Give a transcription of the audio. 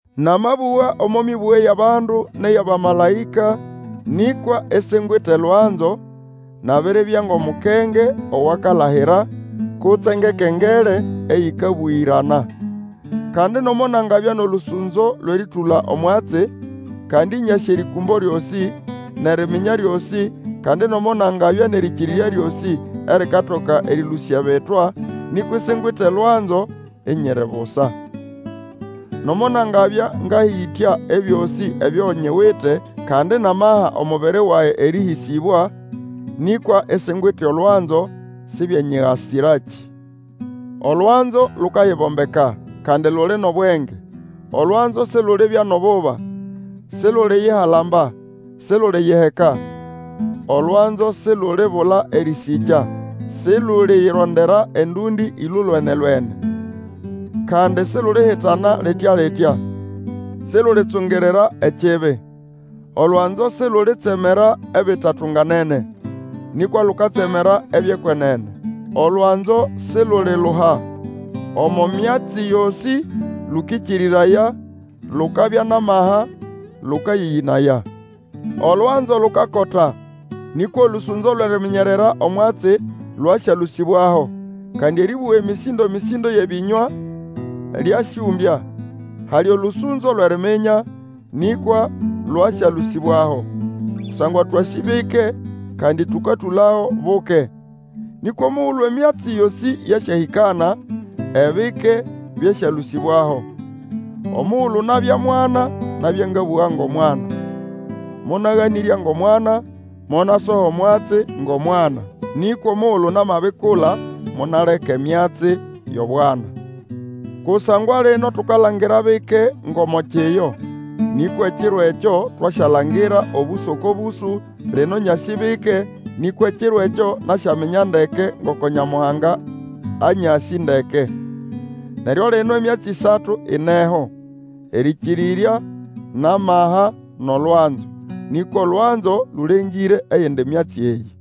Namabũga omo mĩbũge yʼabandu nʼeyʼabamalaĩka, nĩkwa isingwite olwanzo, nabiribya ngʼomukenge owakalahira kutse ngʼekengele eyĩkabũgĩrana. Kandi nomo nangabya nʼolũsũnzo lwʼerĩtũla omwatsi, kandi nyasĩ erĩkũmbo lyosĩ, nʼeriminya lyosĩ, kandi nomo nangabya nʼerĩkĩrĩrya lyosĩ erikatoka erĩlũsya ebitwa, nĩkwa isingwite olwanzo, inyiri busa. Nomo nangabya ngahĩtya ebyosĩ ebyo nyiwite kandi namaha omubiri wage erĩhĩsĩbwa, nĩkwa isingwite olwanzo, sibyenyigasirakĩ. Olwanzo lukayibombeka, kandi luli nʼobwenge; olwanzo silulibya nʼobũha; siluliyihalamba, siluliyiheka. Olwanzo sihulibula erĩsĩkya; siluliyirondera endũndĩ ĩlolwene-lwene; kandi silulihitana litya-litya; silulitsungirira ekibi. Olwanzo silulitsemera ebitatunganene, nĩkwa lukatsemera ebyʼekwenene. Olwanzo siluliluha, omo myatsi yosĩ lũkĩkĩrĩraya, lukabya nʼamaha, lũkayĩyĩnaya. Olwanzo lukakota; nĩkwa olũsũnzo lwʼeriminyerera omwatsi lwasyalũsĩbwaho, kandi erĩbũga emĩsĩndo-mĩsĩndo yʼebĩnywa lyasyũmbya; hali olũsũnzo lwʼeriminya, nĩkwa lwasyalũsĩbwaho. Kusangwa twasĩ bike, kandi tũkatũlago buke. Nĩkwa omugulu emyatsi yosĩ yasyahĩkana, ebike byasyalũsĩbwaho. Omugulu nabya mwana, nabya ngabũga ngʼomwana, monaganĩrya ngʼomwana, monasoha omwatsi ngʼomwana. Nĩkwa omugulu namabikula, monaleka emyatsi yʼobwana. Kusangwa lino tukalangira bike ngʼomo kiyo, nĩkwa ekiro ekyo, twasyalangira obũsũ oko bũsũ; lino nyasĩ bike, nĩkwa ekiro ekyo nasyaminya ndeke ngoko Nyamuhanga anyasĩ ndeke. Neryo lino emyatsi ĩsatu ineho, erĩkĩrĩrya, nʼamaha, nʼolwanzo; nĩkwa olwanzo lũlengĩre eyindi myatsi eyĩ.